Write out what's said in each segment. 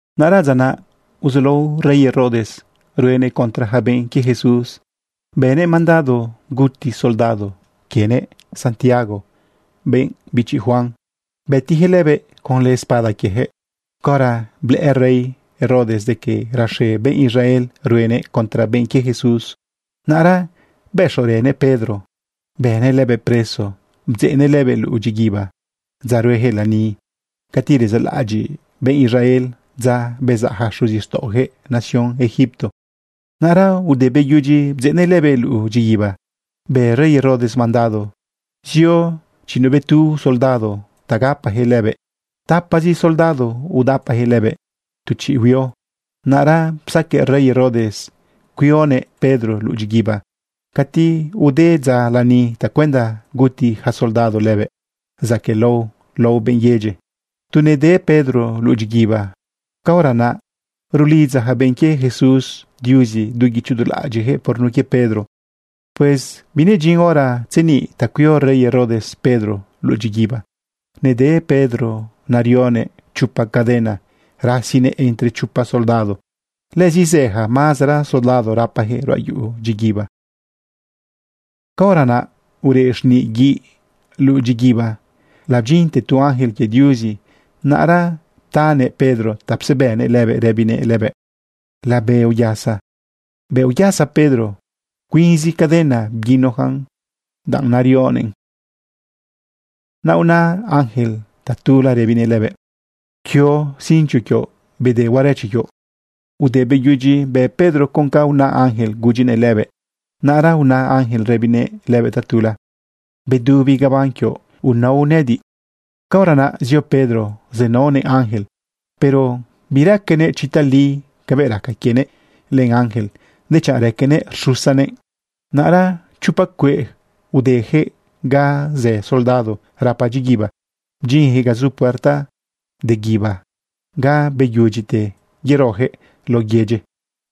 Naꞌra dza naꞌ uzulao rey Herodes ruenëꞌ contra yaca benꞌ quie Jesús. Bënëꞌ mandado guti soldado quienëꞌ Santiago, benꞌ bichi Juan. Bëtiyaquëꞌ lëbëꞌ conlë espada quieyaquëꞌ. Caora blëꞌë rey Herodes de que raxe benꞌ Israel ruenëꞌ contra benꞌ quie Jesús, naꞌra bëxorënëꞌ Pedro bënëꞌ lëbëꞌ preso. Bdzeꞌnëꞌ lëbëꞌ luꞌu dyiguiba dza rueyaquëꞌ lani cati rezaꞌlaꞌadyiꞌ benꞌ Israel dza bezaꞌ yaca xuzixtaꞌoyaquëꞌ nación Egipto. Naꞌra ude beyudyi bdzeꞌnëꞌ lëbëꞌ luꞌu dyiguiba, bë rey Herodes mandado zio chiꞌinuꞌbetu soldado ta gapayaquëꞌ lëbëꞌ. Tapazi soldado udapayaquëꞌ lëbëꞌ tu chiꞌ huio. Naꞌra psaqueꞌ rey Herodes cuionëꞌ Pedro luꞌu dyiguiba cati ude dza lani tacuenda guti ja soldado lëbëꞌ zaquëꞌlao lao benꞌ yedyi. Tu nede Pedro luꞌu dyiguiba, caora naꞌ rulidza yaca benꞌ quie Jesús Diuzi du guicho du laꞌadyiꞌyaquëꞌ por nun quie Pedro. Pues binedyin hora tzeniꞌ ta cuio rey Herodes Pedro luꞌu dyiguiba. Nede Pedro narionëꞌ chopa caden rasinëꞌ entre chopa soldado. Lëzi zë ja mazera soldado rapayaquëꞌ ruꞌa yuꞌu dyiguiba. Caora naꞌ ureꞌ xniꞌ guiꞌ luꞌu dyiguiba labdyinte tu ángel quie Diuzi. Naꞌra ptanëꞌ Pedro ta psebënëꞌ lëbëꞌ rëbinëꞌ lëbëꞌ: ―Labe uyasa. Bëꞌ uyasa Pedro, cuinzi cadena bguinojan danꞌ narionëꞌ. Na ꞌuna ángel tatula rëbinëꞌ lëbëꞌ: ―Pquio cincho quioꞌ bde huarache quioꞌ. Ude beyudyi bë Pedro con ca una ángel gudyinëꞌ lëbëꞌ, naꞌra una ángel rëbinëꞌ lëbëꞌ tatula: ―Bdubi gabán quioꞌ unao nëꞌëdiꞌ. Caora naꞌ zio Pedro zenaonëꞌ ángel, pero biraquenëꞌ chi tali cabëꞌ raca quienëꞌ len ángel, dechanꞌ raquenëꞌ rxusanëꞌ. Naꞌra chopa cueꞌ udeyaquëꞌ ga zë soldado rapa dyiguiba, bdyinyaquëꞌ ga zu puerta de guíba ga beyudyite yeroyaquëꞌ laꞌo yedyi.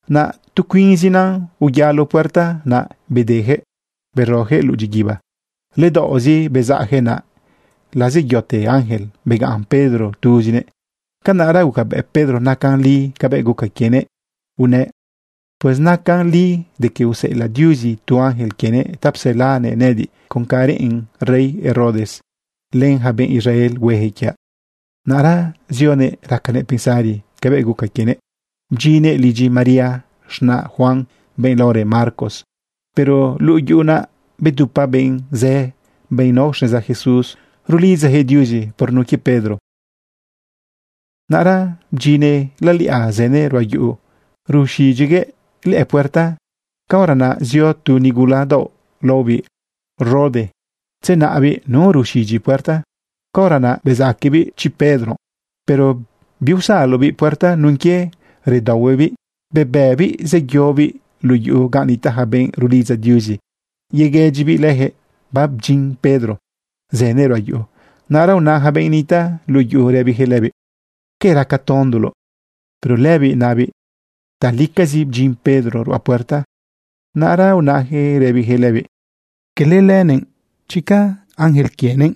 Naꞌ tu cuinzina uyalo puerta naꞌ bedeyaquëꞌ beroyaquëꞌ luꞌu dyiguiba. Ledaoꞌzi bezaꞌyaquëꞌ naꞌ lazeyote ángel, begaꞌn Pedro tuzinëꞌ. Canaꞌra gucabëꞌ Pedro nacan li cabëꞌ guca quienëꞌ, unëꞌ: ―Pues nacan li de que useꞌelaꞌ Diuzi tu ángel quienëꞌ ta pselanëꞌ nëꞌëdiꞌ con ca reꞌen rey Herodes len ja benꞌ Israel huejëꞌ quiaꞌ. Naꞌra zionëꞌ racanëꞌ pensari cabëꞌ guca quienëꞌ bdyinnëꞌ lidyi María, z̃naꞌ Juan, benꞌ laorë Marcos. Pero luꞌu yuꞌu naꞌ babedupa benꞌ zë, benꞌ nao xneza Jesús, rulidzayaquëꞌ Diuzi por nun quie Pedro. Naꞌra bdyinnëꞌ laliꞌa zënëꞌ ruꞌa yuꞌu ruxidyiguëꞌ lëꞌë puerta. Caora naꞌ zio tu nigula daoꞌ laobiꞌ Rode tzenaꞌbiꞌ nu ruxidyi puerta, caora naꞌ bezaquebiꞌ chiꞌ Pedro, pero biusalobiꞌ puerta nun quie redaohuebiꞌ bebiꞌbiꞌ zeyobiꞌ luꞌu yuꞌu gan nitaꞌ ja benꞌ rulidza Diuzi yeguëdyibiꞌ leyaquëꞌ babdyin Pedro zënëꞌ ruꞌa yuꞌu. Naꞌra una ja benꞌ nitaꞌ luꞌu yuꞌu rëbiyaquëꞌ lëbiꞌ: ―¿Que raca tondulo? Pero lëbiꞌ nabiꞌ talicazi bdyin Pedro ruꞌa puerta. Naꞌra unayaquëꞌ rëbiyaquëꞌ lëbiꞌ: ―Cala lëbëꞌ, dechanꞌ ángel quienëꞌ.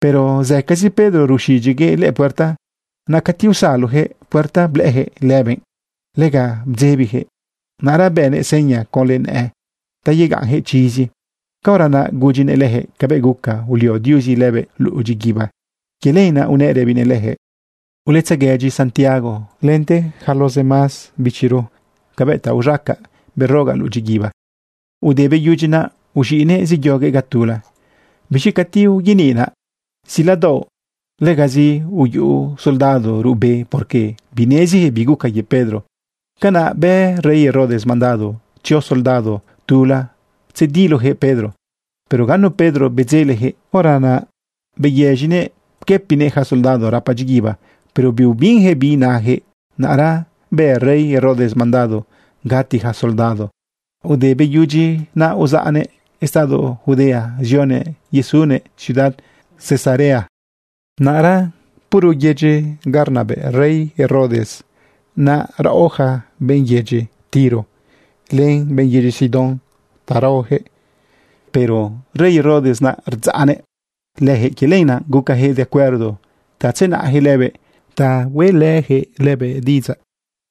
Pero zëcazi Pedro ruxidyiguëꞌ lëꞌë puerta. Naꞌ cati usaloyaquëꞌ puerta blëꞌëyaquëꞌ lëbëꞌ, lega bdzebiyaquëꞌ. Naꞌra bënëꞌ seña conlë nëꞌë ta yegaꞌnyaquëꞌ chizi. Caora naꞌ gudyinëꞌ leyaquëꞌ cabëꞌ guca ulio Diuzi lëbëꞌ luꞌu dyiguiba. Quie lenaꞌ unëꞌ rëbinëꞌ leyaquëꞌ: ―Uletzeguëdyi Santiago lente yaca los demás bichiro cabëꞌ ta uz̃acaꞌ berogaꞌ luꞌu dyiguiba. Ude beyudyi naꞌ, uz̃iꞌnëꞌ zeyoguëꞌ ga tula. Biz̃i cati uyeniꞌnaꞌ ziladaoꞌ, legazi uyuꞌu soldado ruꞌbe, porque bineziyaquëꞌ bi guca quie Pedro. Canaꞌ bë rey Herodes mandado tzio soldado tula tzediloyaquëꞌ Pedro, pero ganu Pedro bedzeleyaquëꞌ. Hora naꞌ beyëz̃inëꞌ pquëpinëꞌ ja soldado rapa dyiguiba, pero biubinyaquëꞌ bi inayaquëꞌ. Naꞌra bë rey Herodes mandado gati yaca soldado. Ude beyudyi naꞌ, uzaꞌnëꞌ estado Judea zionëꞌ yesunëꞌ ciudad Cesarea. Naꞌra puro yedyi ga rnabëꞌ rey Herodes naꞌ raꞌo yaca benꞌ yedyi Tiro len benꞌ yedyi Sidón ta raoyaquëꞌ. Pero rey Herodes naꞌ rdzaꞌnëꞌ leyaquëꞌ. Quie lenaꞌ gucayaquëꞌ de acuerdo ta tzenaꞌyaquëꞌ lëbëꞌ ta hueꞌlëyaquëꞌ lëbëꞌ diꞌidzaꞌ.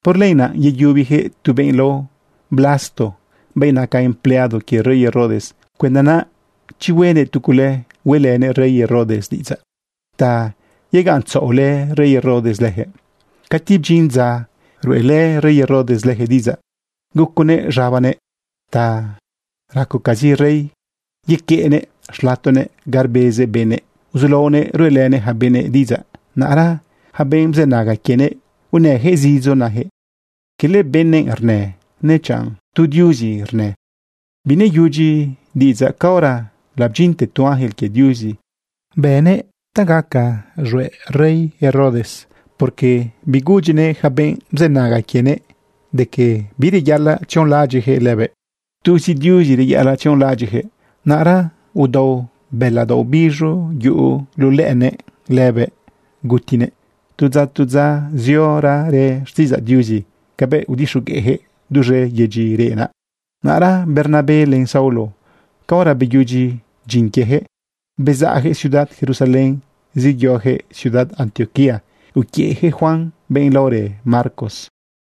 Por lenaꞌ yeyubiyaquëꞌ tu benꞌ lao Blasto, benꞌ naca empleado quie rey Herodes, cuenda naꞌ chi huenëꞌ tu cule hueꞌlënëꞌ rey Herodes diꞌidzaꞌ ta yegaꞌntzaꞌolë rey Herodes leyaquëꞌ. Cati bdyin dza ruꞌelë rey Herodes leyaquëꞌ diꞌidzaꞌ, guconëꞌ z̃abanëꞌ ta racocazi rey, yequeꞌnëꞌ xlatonëꞌ ga rbezëꞌ benëꞌ, uzulaonëꞌ ruꞌelënëꞌ yaca benëꞌ diꞌidzaꞌ. Naꞌra yaca benꞌ bzënaga quienëꞌ, unëyaquëꞌ zidzo nayaquëꞌ: ―¡Quele benëꞌ rnë, nechanꞌ tu diuzi rnë! Bineyudyi diꞌidzaꞌ caora labdyinte tu ángel quie Diuzi bënëꞌ ta gaca z̃hueꞌ rey Herodes, porque bigudyinëꞌ yaca benꞌ bzënaga quienëꞌ de que bireyaꞌalaꞌ tzionlaꞌadyiꞌjëꞌ lëbëꞌ, tuzi Diuzi reyaꞌalaꞌ tzionlaꞌadyiꞌjëꞌ. Naꞌra udao bëla daoꞌ biz̃u yuꞌu luꞌu lëꞌënëꞌ lëbëꞌ gutinëꞌ. Tu dza, tu dza, ziorarë xtiꞌidzaꞌ Diuzi cabëꞌ udixogueꞌjëꞌ duz̃e yedyi reꞌ naꞌ. Naꞌra Bernabé len Saulo, caora beyudyi dyin quieyaquëꞌ, bezaꞌyaquëꞌ ciudad Jerusalén zeyoyaquëꞌ ciudad Antioquía uquiëꞌyaquëꞌ Juan, benꞌ laorë Marcos.